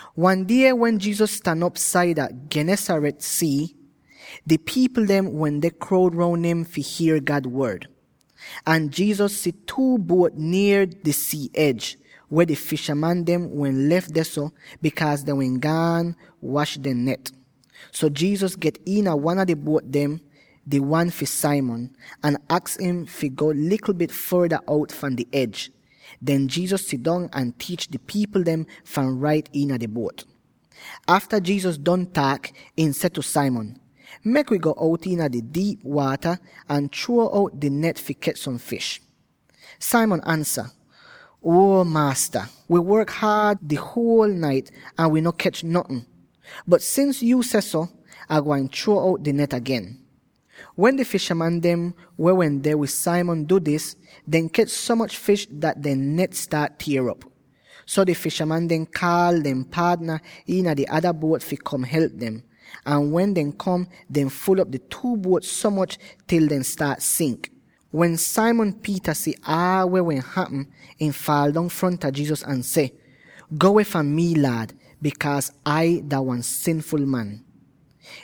Wan die wen Jesus stan op saida Gennesaret sii, di pipl dem wende kroud roun im fi hier God Wod. Ahn Jesus si two buot nier di sii edj, weh di fishaman dem wehn lef dehso, bikaaz dehn wehn gaan wash dehn net. So Jesus get iina wan a di buot dem —di wan fi Simon— ahn aks im fi go likl bit forda out fahn di edj. Den Jesus sidong ahn tiich di pipl dem fahn rait iina di buot. Afta Jesus don taak, ihn seh tu Simon, “Mek wi go out iina di diip waata, ahn chruo out di net fi kech som fish.” Simon ansa, “Uo Maasta, wi work so haad di huol nait ahn wi no kech notn. Bot sins yuu sehso, Ah gwain chruo out di net agen.” Wen di fishaman dem weh wende wid Simon du dis, dehn kech so moch fish dat dehn net staat tier op. So di fishaman dem kaal dehn paadna iina di ada buot fi kom help dem; ahn wen dehn kom, dehn ful'op di two buot so moch til dehn staat sink! Wen Simon Peter si aal weh wehn hapm, ihn faal dong fronta Jesus ahn seh, “Go weh fahn mi Laad, bikaaz Ah dah wan sinful man!”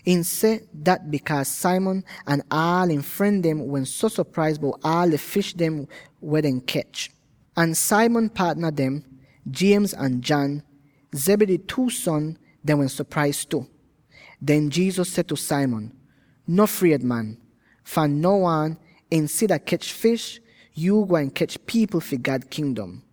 Ihn seh dat bikaaz Simon ahn aal ihn fren dem wehn so sopraiz bout aal di fish weh dehn kech. Ahn Simon paadna dem, James ahn John, —Zebedee two son— dehn wehn sopraiz tu. Den Jesus seh tu Simon, “No fried, man; fahn now aan, insida kech fish, yuu gwain kech pipl fi God Kingdom.”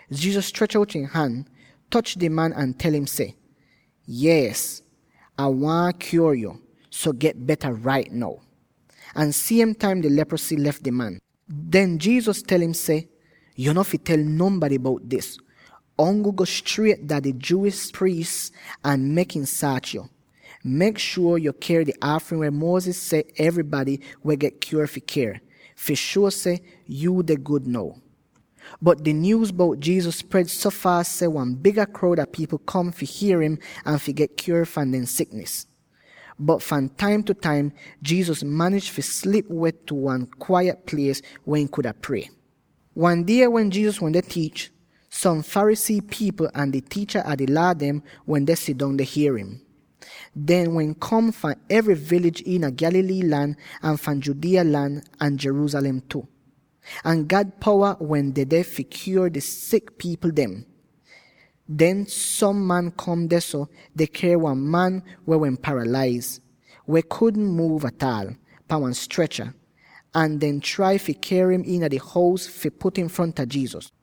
Jesus strech out ihn han, toch di man ahn tel im seh, “Yees, Ah waahn kyuor yo, so get beta rait now!” Ahn siem taim di leprosy lef di man. Den Jesus tel im seh, “Yo no fi tel nonbady bout dis; ongl go striet dah di Jewish priis ahn mek im saach yo. Mek shuor yo ker di aafrin weh Moses seh enybady weh get kyuor fi ker, fi shuo seh yu deh gud now.” Bot di nyuuz bout Jesus spred so faas dat wan biga kroud a pipl kom fi hier im ahn fi get kyuor fahn dehn siknis. Bot fahn taim tu taim Jesus manij fi slip weh tu wan kwaiyet plies weh ihn kuda prie. Wan die wen Jesus wende tiich, som Pharisee pipl ahn di tiicha a di Laa dem wende sidong deh hier im. Dehn wehn kom fahn evry toun iina Galilee lan ahn fahn Judea lan ahn Jerusalem tu. Ahn God powa wehn dedeh fi kyuor di sik pipl dem. Den som man kom dehso, deh ker wan man weh wehn paralaiz —weh kudn muuv ataal— pahn wan strecha, ahn dehn trai fi ker im iina di hous, fi put im fronta Jesus.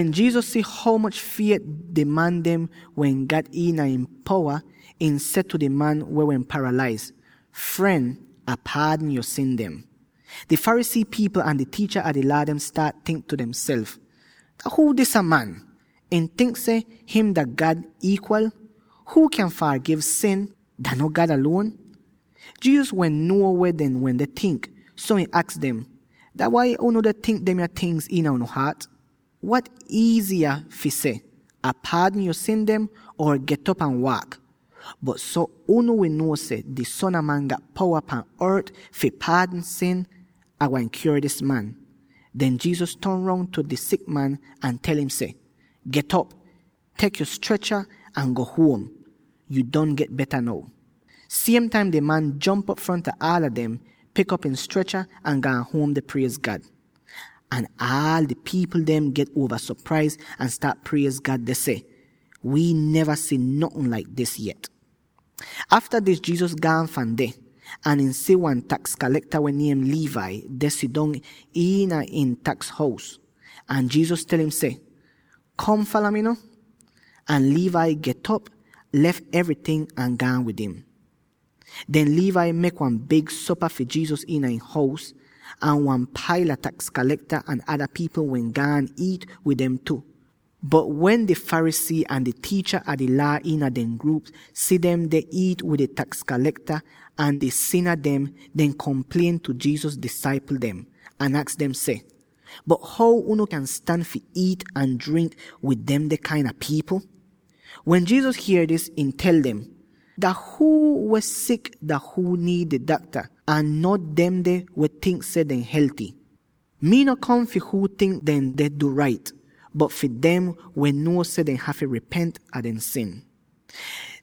Wen Jesus si ho moch fiet di man dem wehn gat iina ihn powa, ihn seh tu di man weh wehn paralaiz, “Fren, Ah paadn yo sin dem.” Di Pharisee pipl ahn di tiicha a di Laa dem staat tink tu demself, “Dah huu disa man; ihn tink seh him dah God iikwal? Huu kyan fargiv sin; dah no God aluon?” Jesus wehn nuo weh dehn wende tink, so ihn aks dem, “Dah wai unu deh tink demya tingz iina unu haat? Wat iiziya fi seh, ‘Ah paadn yo sin dem,’ or ‘Get'op ahn waak?’ Bot so unu wi nuo seh di Son a Man gat powa pan ort fi paadn sin, Ah gwain kyuor dis man.” Den Jesus ton roun tu di sik man, ahn tel im seh, “Get'op, tek op yo strecha ahn go huom; yu don get beta now.” Siem taim di man jomp op fronta aala dem, pik op ihn strecha, ahn gaan huom deh priez God! Ahn aal di pipl dem get uova sopraiz ahn staat priez God deh seh, “Wii neva si notn laik dis yet!” Afta dis Jesus gaan fahn dehso, ahn ihn si wan taks kalekta weh niem Levi, deh sidong iina ihn taks hous. Ahn Jesus tel im seh, “Kom! Fala mi no!” Ahn Levi get'op, lef evryting, ahn gaan wid im. Den Levi mek wan big sopa fi Jesus iina ihn hous, ahn wan paila taks kalekta ahn ada pipl wehn gaan iit wid dem tu. Bot wen di Pharisee ahn di tiicha a di Laa iina dehn gruup si dem deh iit wid di taks kalekta ahn di sina dem, dehn komplien tu Jesus disaipl dem, ahn aks dem seh, “Bot how unu kyan stan fi iit ahn drink wid demde kain a pipl?” Wen Jesus hier dis, ihn tel dem, “Dah huu weh sik dah huu niid di dakta; ahn no demde weh tink seh dehn helty. Mii no kom fi huu tink dehn deh du rait, bot fi dem weh nuo seh dehn hafy ripent a dehn sin.”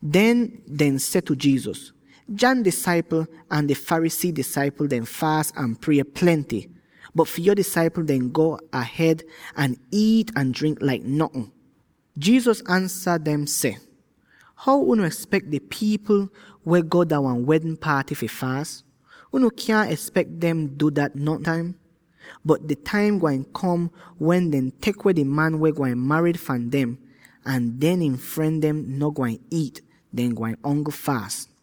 Den, dehn seh tu Jesus, “John disaipl ahn di Pharisee disaipl dem faas ahn prie plenty, bot fi yo disaipl dehn go ahed ahn iit ahn drink laik notn.” Jesus ansa dem seh, “How unu espek di pipl weh go dah wan wedn paaty fi faas? Unu kyaahn espek dem fi du dat nontaim. Bot di taim gwain kom wen dehn tek weh di man weh gwain marid fahn dem, ahn den ihn fren dem no gwain iit; dehn gwain ongl faas.”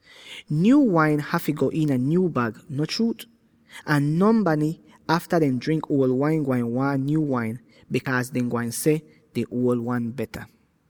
Nyuu wain hafy go iina nyuu bag, no chruut?” Ahn nonbady, afta dehn drink uol wain, gwain waahn nyuu wain, bikaaz dehn gwain seh, “Di uol wan beta.”